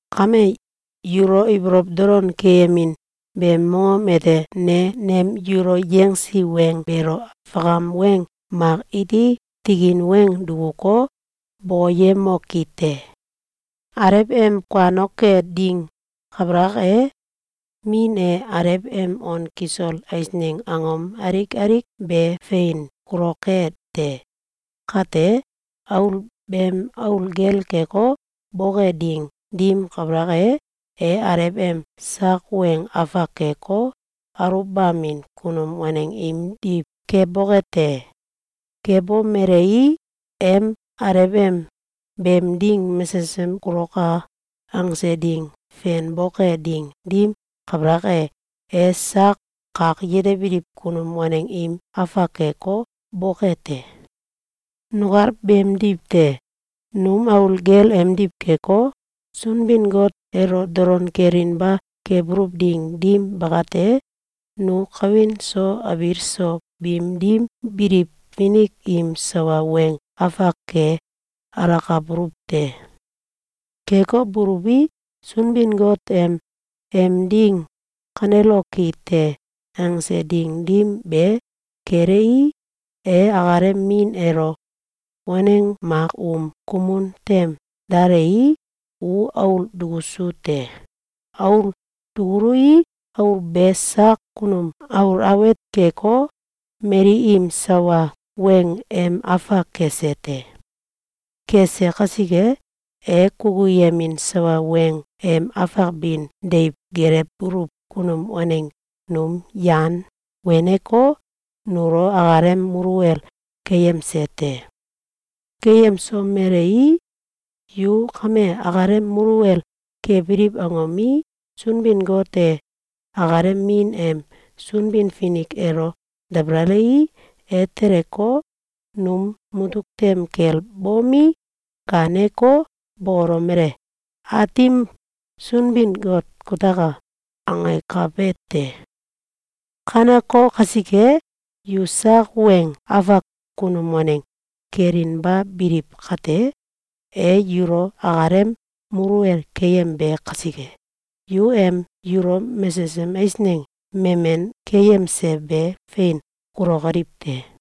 Kame, yulo ibolow dolon keyemin beem mongom ete ne nem yulo yangsi weng beelo fakam weng mak iti tikin weng dukuko, bokoyemokite: Alew em kuanoke ding kabalak e, min e alew em on kisol eisneng angom alik alik be fein kuloke te. Kate, aul beem aul gel keko, boke ding dim kabalak e, e alew em sak weng afak keko, aluwbamin kunum waneng imdiw keboke te. Kebomelei, em alew em “Beem ding mesesem kuloka!”, angse ding fenboke ding dim kabalak e, e sak kak yetebiliw kunum waneng im afak keko, boke te. Nukal beemdiw te. Num aul gel emdiw keko, Sunbin-Got elo dolon kelinba kebuluw ding dim bakate, nu kawin so abiil so biim dim biliw finik im sawa weng afak ke alakabuluw te. Keko buluwi, Sunbin-Got em “Beem ding kaneloki te!”, angse ding dim be kelei, e akalem Min elo waneng mak um kumun tem dalei, u aul dukusu te. Aul dukului, aul be sak kunum aul awet keko, mali im sawa weng em afak kese te. Kese kasike, e kukuyemin sawa weng em afak bin deiw gelewbuluw kunum waneng num yan weneko, nulo akalem muluwel keyemse te. Keyemsomelei, yu kame akalem muluwel kebiliw angomi, Sunbin-Got e akalem Min em Sunbin-Finik elo dabalalei, e teleko, num mutuk tem kel bomi, gaaneko, bokolomele: “Aatim Sunbin-Got kutaka!”, angakabe te. Kaneko kasike, yu sak weng afak kunum waneng kelinba biliw kate, e yulo akalem muluwel keyembe kasike, yu em yulo mesesem eisneng memen keyemse be fein kulokoliw te.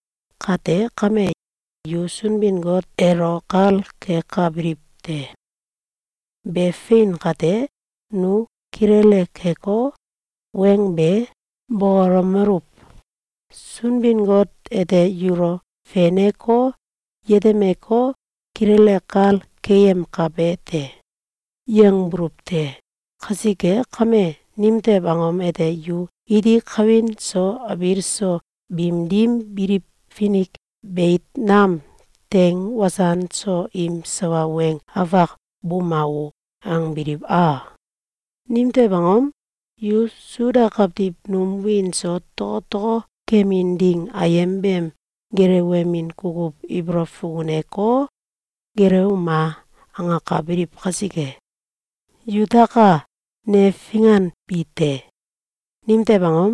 Kate kame, yu Sunbin-Got elo kal kekabiliw te. (Be fein kate, nu kilele keko, weng be bokolomeluw: “Sunbin-Got ete yulo feneko, yetemeko, kilele kal keyemkabe te.”, yangbuluw te!) Kasike kame, nimtew angom ete yu iti kawin so abiil so biim dim biliw finik beit nam teng wasan so im sawa weng afak “Buma o!”, angbiliw a? Nimtew angom? Yu Suda kawtiw num wiin so tokotoko kemin ding ayem beem gelewemin kukuw ibolow fukuneko, “Gelewuma!”, angakabiliw kasike. Yutaka! Ne finganbi te! Nimtew angom?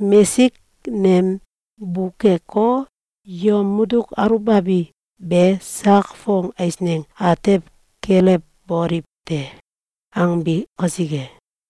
Mesik nem bukeko, yom mutuk aluwbabi be “Sak fong eisneng atew kelewboliw te!”, angbi kasike.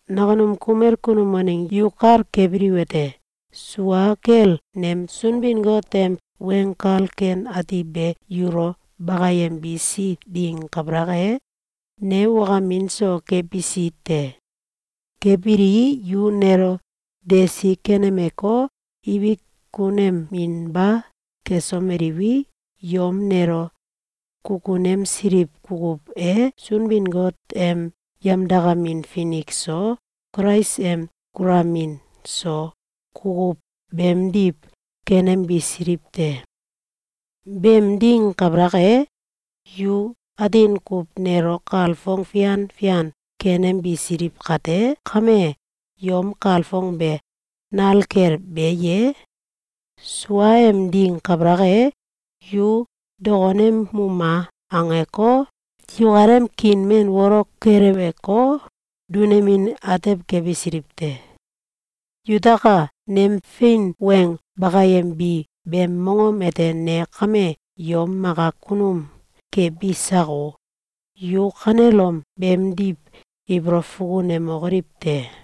Nakunum kumel kunum waneng yu kal kebiliwete: Sua kel nem Sunbin-Got em Weng Kal Ken Ati be yulo bakayembisi ding kabalak e, ne wakamin so kebisi te. Kebilii, yu nelo desi kenemeko, ibik kuneminba kesomeliwi, yom nelo kukunemsiliw kukuw e Sunbin-Got em yemdakamin finik so, Kulais em kulamin so, kukuw beemdiw kenembisiliw te. Beem ding kabalak e, yu atin kuw nelo kalfong fian fian kenembisiliw kate kame, yom kalfong be, nal kel be ye? Suaem ding kabalak e, yu “Dokonemuma!”, angeko, yukalem kiin men wolok keleweko, dunemin atew kebisiliw te. Yutaka! Nem fein weng bakayembi beem mongom ete ne kame yom maka kunum kebi sako? Yu kanelom beemdiw ibolow fukunemokoliw te!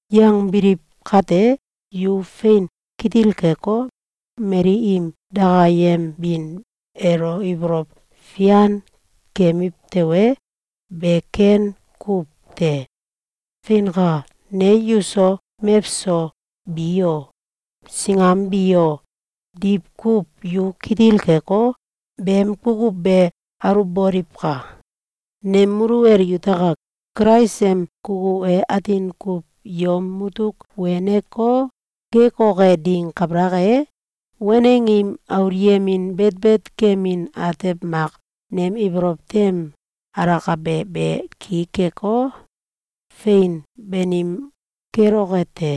Yangbiliw kate, yu fein kitil keko, mali im dakayembin elo ibolow fian kemiw tewe, be ken kukuw te. Feinka! Ne yuso mewso bi o, singam bi o, diwkuw yu kitil keko, beem kukuw be aluwboliwka! Nem muluwel yutaka! Kulais em kukuw e atin kuw yom mutuk weneko, gekoke ding kabalak e, waneng im aulyemin betbet kemin atew mak nem ibolow tem alakabe be ki keko, fein banim keloke te.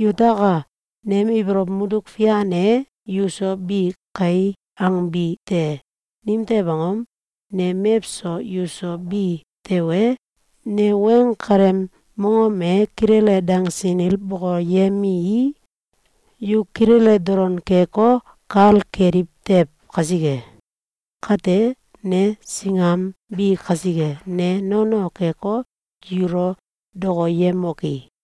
Yutaka! Nem ibolow mutuk fian e “Yuso bi kai!”, angbi te. Nimtew angom? Ne mewso yuso bi tewe, ne weng kaleem mongom e kilele dangsinil bokoyemii, yu kilele dolon keko, kal keliw tew kasike. Kate, ne singam bi kasike, ne nono keko, yulo dokoyemoki?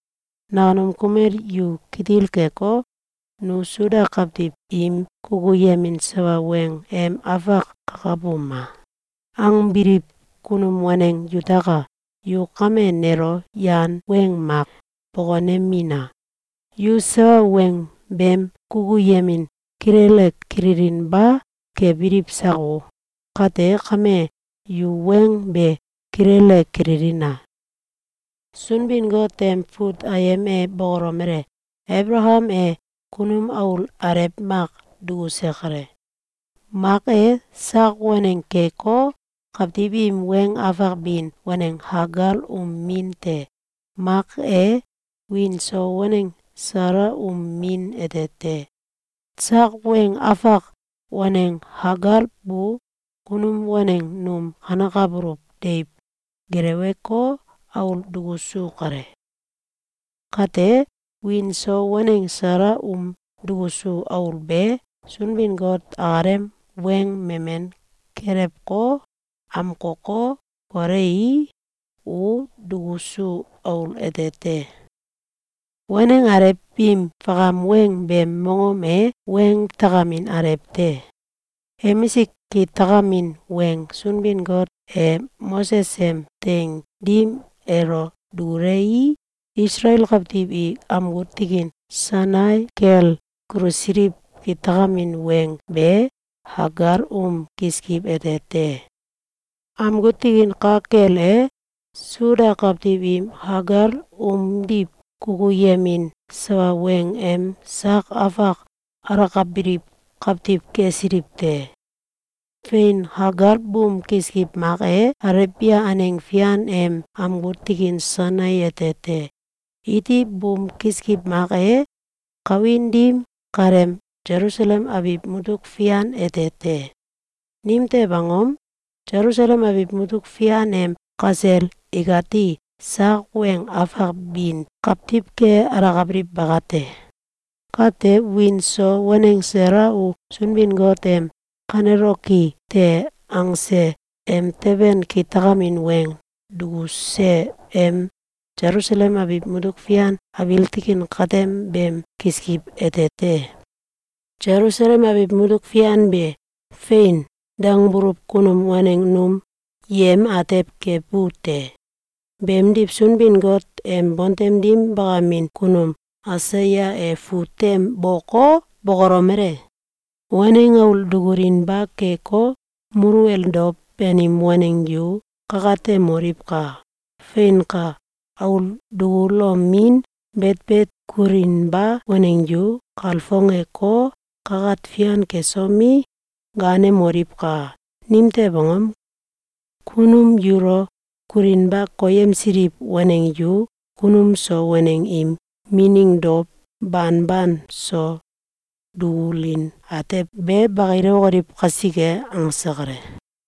Nakunum kumel yu kitil keko, “Nu Suda kawtiw im kukuyemin sawa weng em afak kakabuma!”, angbiliw kunum waneng yutaka! Yu kame nelo yan weng mak bokonemina! Yu sawa weng beem kukuyemin kilele kililinba kebiliw sako? Kate kame, yu weng be kilele kililina! Sunbin-Got em fut ayem e bokolomele: Abalakam e kunum aul alew mak dukuse kale. Mak e, sak waneng keko, kawtiw im weng afak bin waneng Kagal um min te. Mak e, wiin so waneng Sala um min ete te. Sak weng afak waneng Kagal bu kunum waneng num kanekabuluw deiw geleweko, aul dukusu kale. Kate, wiin so waneng Sala um dukusu aul be, Sunbin-Got akalem weng memen kelewko, amkoko, kolei, u dukusu aul ete te. Waneng alew biim fakam weng beem mongom e weng takamin alew te. Emisik kitakamin weng Sunbin-Gote Moses em teing dim elo dulewei, Isalael kawtiw i amgu tikin Sainai kel kulusiliw kitakamin weng be Kagal um kiskiw ete te. Amgu tikin ka kel e, Suda kawtiw i Kagal umdiw kukuyemin sawa weng em sak afak alakabiliw kawtiw kesiliw te. Fein! Kagal buum kiskiw mak e Alebia aneng fian em amgu tikin Sainai ete te. Iti buum kiskiw mak e, kawin dim kaleem Selusalem abiw matuk fian ete te. Nimtew angom? Selusalem abiw mutuk fian em kasel ikati sak weng afak bin kawtiw ke alakabiliw bakate. Kate, wiin so waneng Sala u Sunbin-Got em “Kaneloki te!”, angse emteben kitakamin weng dukuse em Selusalem abin mutuk fian abiil tikin katem beem kiskiw ete te. Selusalem abiw mutuk fian be “Fein!”, dangbuluw kunum waneng num yem atew kebu te. Beemdiw, Sunbin-Got em bontem dim bakamin kunum Aisaya e fut tem boko, bokolomele: “Waneng aul dukulinba keko, muluwel dow banim waneng yu kakatemoliwka! Feinka! Aul dukulomin betbet kulinba waneng yu kalfongeko, kakat fian kesomi, gaanemoliwka! Nimtew angom? Kunum yulo kulinba koyemsiliw waneng yu kunum so waneng im mining dow banban so dukulin atew be bakilewokoliw kasike.”, angse kale.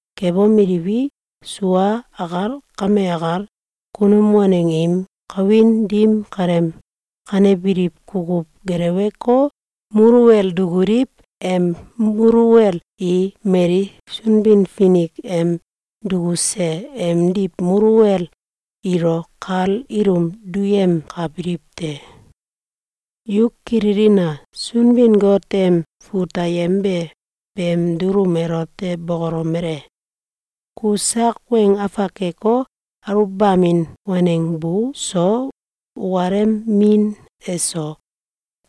Kebomeliwi, sua akal kame akal, kunum waneng im kawin dim kaleem kanebiliw kukuw geleweko, muluwel dukuliw em muluwel i mali Sunbin-Finik em dukuse emdiw muluwel ilo kal ilum duyemkabiliw te. Yu kililina! Sunbin-Got em fut ayem be beem dulum elote bokolomele: “Ku sak weng afak keko, aluwbamin waneng bu so, ukalem min eso,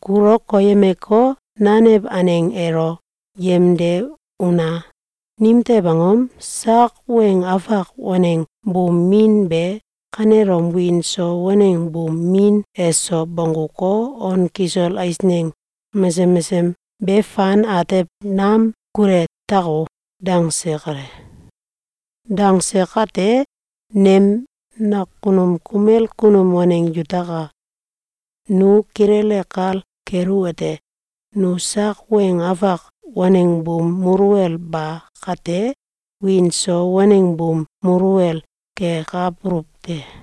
kulu koyemeko, nanew aneng elo yemde una! Nimtew angom? Sak weng afak waneng buum min be kanelom wiin so waneng buum min eso bongguko, on kisol eisneng mesesem mesesem be fan atew nam kule tako!”, dangse kale. Dangse kate, nem nakunum kumel kunum waneng yutaka! Nu kilele kal keluwete: Nu sak weng afak waneng buum muluwel ba kate, wiin so waneng buum muluwel kekabuluw te.